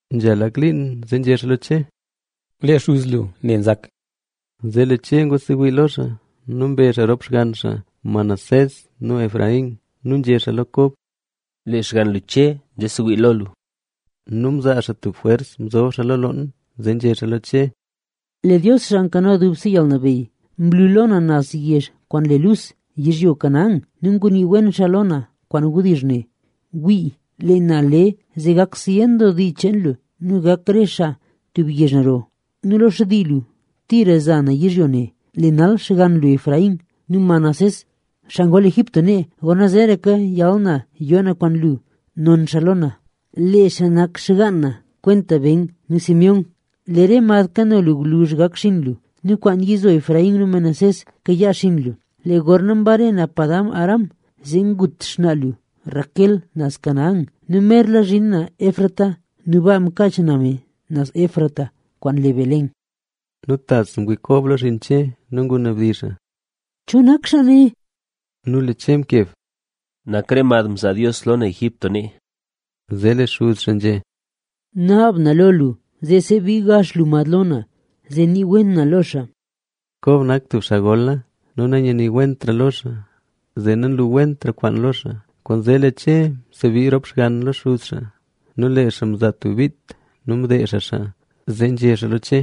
Nzha lak liin, zee nzhé xaa lo Che: —Lee xuz lu ne nzak. Zee lee Che ngwasewii lo xaa nu mbe xaa rop xgann xaa Manasés nu Efraín. Nu nzhé xaa lo Kob: —Lee xgann lu Che nzesewii lo lu. Nu mzaa xaa tub jwers mzob xaa lo loon, zee nzhé xaa lo Che: —Lee Dios, xaa nkano dubse yalnabeyy, mlu lo na naz yezh kwaan le Luz, nu ngunii wen xaa lo na kwaan wdizh ne: “Wii, lee na le zee gak zyen doo dii cheen lu nu gak re xaa tub yezh naro. Nu lo xtii lu tira za na yizhyo ne.” Lee nal xgann lu Efraín nu Manasés xaa ngol Egipto nee, gorna zeeraka yal na yoo na kwaan lu, non xaa lo na. Lee xaa nak xgaan na kwenta Ben nu Simeón. Lee re mad kano lu gwluzh gak xinn lu nu kwaan yizo Efraín nu Manasés kayaa xinn lu. Lee gorna mbare na Padan-aram, zee ngut xnaa lu Raquel, naz Canaán. Nu merla zhin na Efrata nu baa mkaach na me naz Efrata kwaan le Belén. Nu tas ngwii Kob lo xinn Che nu ngunabdizh xaa: —¿Cho nak xaa ne? Nu lee Che mkeb: —Nak re mad mzaa Dios lo na Egipto nee. Zee lee xuz xaa nzhé: —Naab na lo lu zee sebii gax lu mad lo na, zee nii wen na lo xaa. Kob nak tub xaa gola nu nanyaniwentra lo xaa, zee nanluwentra kwaan lo xaa. Kwaanzee lee Che msebii rop xgann lo xuz xaa nu lee xaa mzaa tub bit nu mdeezh xaa xaa. Zee nzhé xaa lo Che: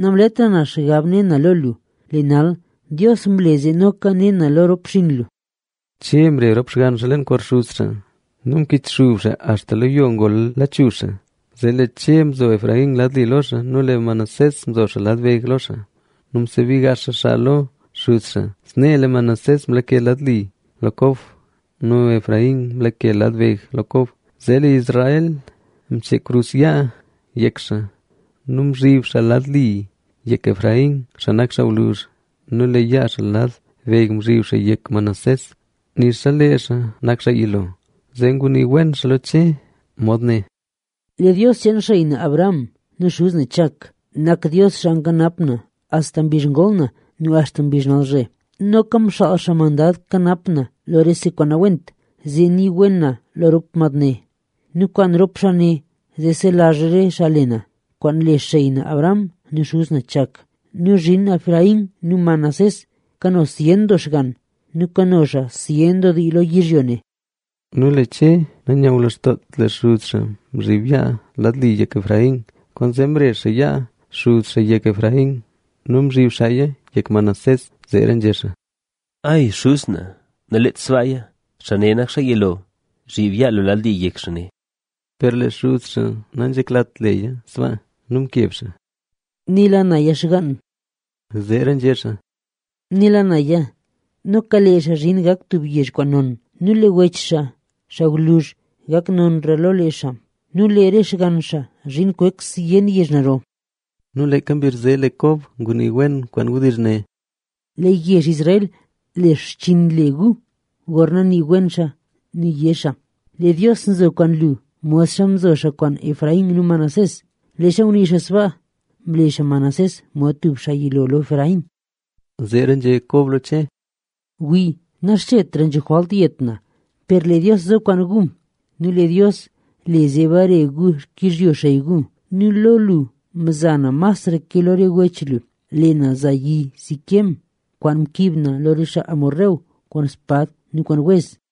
—Namletra na xgab ne na lo lu, ¡lee nal Dios mle zee noka ne na lo rop xinn lu! Che mre rop xgann xaa leen kor xuz xaa nu mkichxub xaa axta mla lachuzh xaa lo yo. Zee lee Che mzo Efraín lad li lo xaa nu lee Manasés mzo xaa lad beg lo xaa. Nu msebii gax xaa xaa lo xuz xaa. Snee lee Manasés mlake lad li lo Kob nu Efraín mlake lad beg lo Kob. Zee lee Israel mchee krus yaa yek xaa nu mzhib xaa lad li yek Efraín, xaa nak xaa gwluzh. Nu lee yaa xaa lad beg mzhib xaa yek Manasés, nixa lee xaa nak xaa yilo. Zee ngunii wen xaa lo Che, mod ne: —Lee Dios cheen xey na Abraham nu xuz na Chak nak Dios xaa nkanap na axta mbizh ngol na nu axta mbizh nalzhe. Nu noka xaa nak mandad nkanap na lo rese kwaan nawent, lee xaa nii wen lo rop mad ne. Nu kwaan rop xaa ne, zee selazh re xaa le na, kwaan le xey na Abraham nu xuz na Chak. Nu zhin Efraín nu Manasés kano zyen doo xgann nu kano xaa zyen doo dii lo yizhyo ne. Nu lee Che nanyulazhdoot lee xuz xaa mzhib yaa lad li yek Efraín. Kwaanzee mre xaa yaa xuz xaa yek Efraín nu mzhib xaaya yek Manasés. Zee nzhé xaa: —¡Ay xuz na, naleet sbaaya! Xaa ne nak xaa yilo. Zhib yaa lu lad li yek xaa ne. Per lee xuz xaa nanzheklat leya sbaa nu mkeb xaa: —Nela naya, xgaan. —Zeera nzhé xaa— Nela naya. Noka lee xaa zhin gak tub yezh kwaan non. Nu lee wech xaa, xaa gwluzh gak nonra lo lee xaa. Nu lee re xgann xaa zhin kwek zyen yezh naro. Nu leeka mbizh zee lee Kob ngunii wen kwaan wdizh ne: Lee yezh Israel le xchinn gu gorna nii wen xaa nu yé xaa: “Lee Dios zo kwaan lu, modxa mzo xaa kwaan Efraín nu Manasés”. Leezha ngunii xaa sbaa, mle xaa Efraín mod tub xaa yilo lo Manasés. Zeera nzhé Kob lo Che: —Wii, naxchetra nzho jwalt yet na. Per lee Dios zo kwaan gu nu lee Dios le zee bare gu xkizhyo xey gu. Nu lo lu mza na masra ke lo re wech lu. Lee na za yi Siquem kwaan mkiib na lo re xaa Hesbón kwaan spad nu kwaan wez.